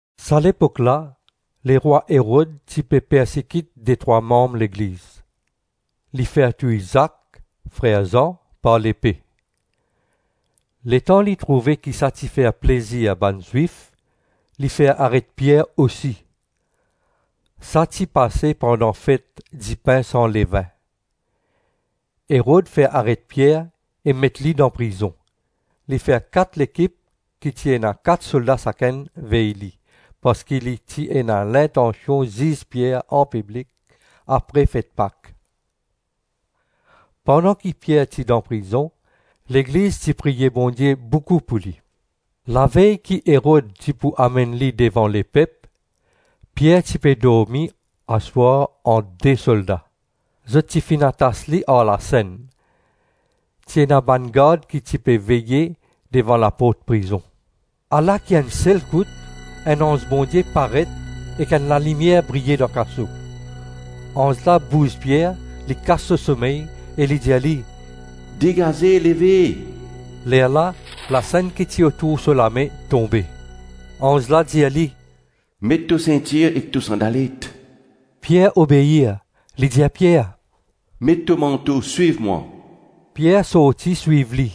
Sa lepok la lerwa Erod ti pe persekit detrwa manm Legliz. Li fer touy Zak, frer Zan, par lepe. Letan li trouve ki sa ti fer plezir bann Zwif li fer aret Pier osi. Sa ti pase pandan fet dipin san levin. Erod fer aret Pier e met li dan prizon. Li fer kat lekip ki ena kat solda sakenn vey li, parski li ti ena lintansion ziz Pier anpiblik apre fet Pak. Pandan ki Pier ti dan prizon Legliz ti priye Bondie boukou pou li. Lavey ki Erod ti pou amenn li devan lepep, Pier ti pe dormi aswar ant de solda. Zot ti finn atas li ar lasenn. Ti ena bann gard ki ti pe veye devan laport prizon. Ala ki enn selkout enn anz Bondie paret ek enn lalimier briye dan kaso. Anz la bouz Pier, li kas so somey, e li dir li, “Degaze-leve!” Lerla lasenn ki ti otour so lame tonbe. Anz la dir li, “Met to sintir ek to sandalet.” Pier obeir. Li dir Pier, “Met to manto, swiv mwa.” Pier sorti swiv li.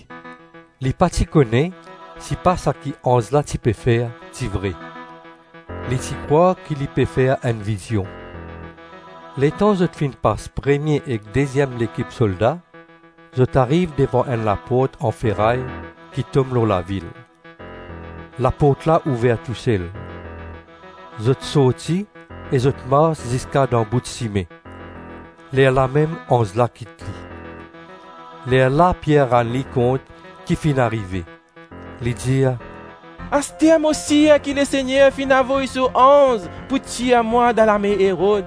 Li pa ti kone sipa saki anz la ti pe fer, ti vre. Li ti krwar ki li pe fer enn vizion. Letan zot finn pas premie ek deziem lekip solda, zot ariv devan enn laport an feray ki tom lor lavil. Laport la ouver tousel. Zot sorti e zot mars ziska danbout sime; lerlamem anz la kit li. Lerla Pier rann li kont ki finn arive. Li dir, “Aster mo sir ki Lesegner finn avoy so anz pou tir mwa dan lame Erod.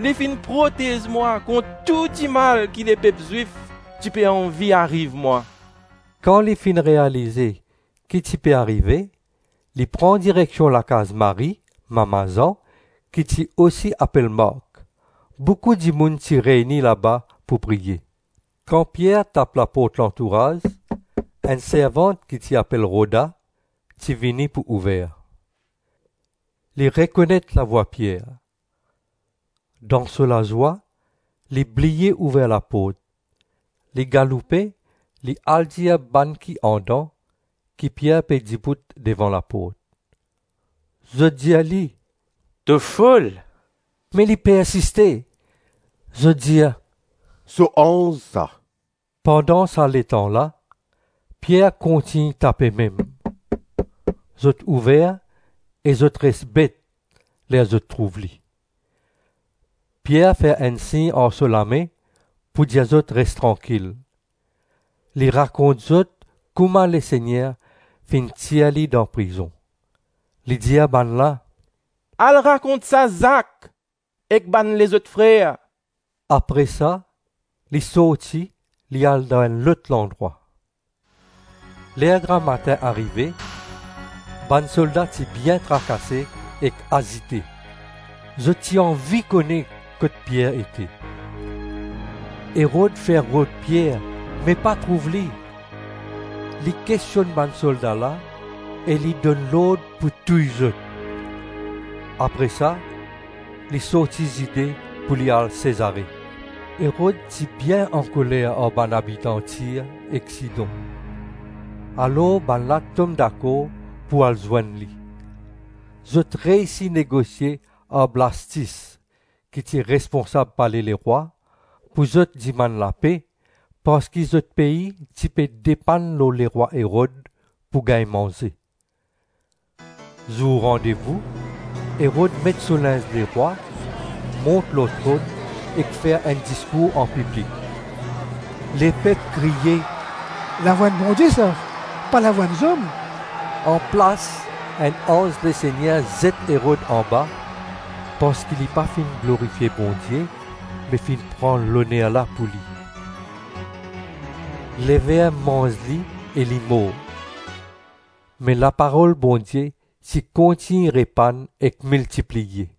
Li finn protez mwa kont tou dimal ki lepep Zwif ti pe anvi ariv mwa.” Kan li finn realize ki ti pe arive, li pran direksion lakaz Marie, mama Zan, ki ti osi apel Mark. Boukou dimoun ti reyni laba pou priye. Kan Pier tap laport lantouraz, enn servant ki ti apel Roda ti vini pou ouver. Li rekonet lavwa Pier. Dan so lazwa li bliye ouver laport, li galoupe li al dir bann ki andan ki Pier pe dibout devan laport. Zot dir li, “To fol.” Me li persiste. Zot dir, “So anz sa.” Pandan sa letan la, Pier kontign tape mem. Zot ouver, e zot res bet ler zot trouv li. Pier fer enn sign ar so lame pou dir zot res trankil. Li rakont zot kouma Lesegner finn tir li dan prizon. Li dir bannla, “Al rakont sa Zak ek bann lezot frer.” Apre sa li sorti li al dan enn lot landrwa. Ler gramatin arive, bann solda ti bien trakase ek azite. Zot ti anvi kone kot Pier ete. Erod fer rod Pier, me pa trouv li. Li kestionn bann solda la e li donn lord pou touy zot. Apre sa, li sorti Zide pou li al Sezare. Erod ti bien ankoler ar bann abitan Tir ek Sidon. Alor bannla tom dakor pou al zwenn li. Zot reysi negosie ar Blastis ki ti responsab pale lerwa, pou zot dimann lape, parski zot pei ti pe depann lor lerwa Erod pou gagn manze. Zour randevou, Erod met so linz lerwa, mont lor tronn ek fer enn diskour anpiblik. Lepep kriye, “Lavwa enn bondie sa, pa lavwa enn zom.” Anplas enn anz Lesegner zet Erod anba parski li pa finn glorifie Bondie, me finn pran loner la pou li. Lever manz li e li mor. Me laparol Bondie ti kontign repann ek miltipliye.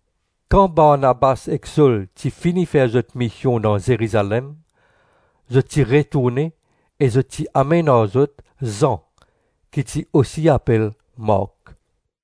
Kan Barnabas ek Sol ti fini fer zot mision dan Zerizalem, zot ti retourne e zot ti amenn ar zot Zan ki ti osi apel Mark.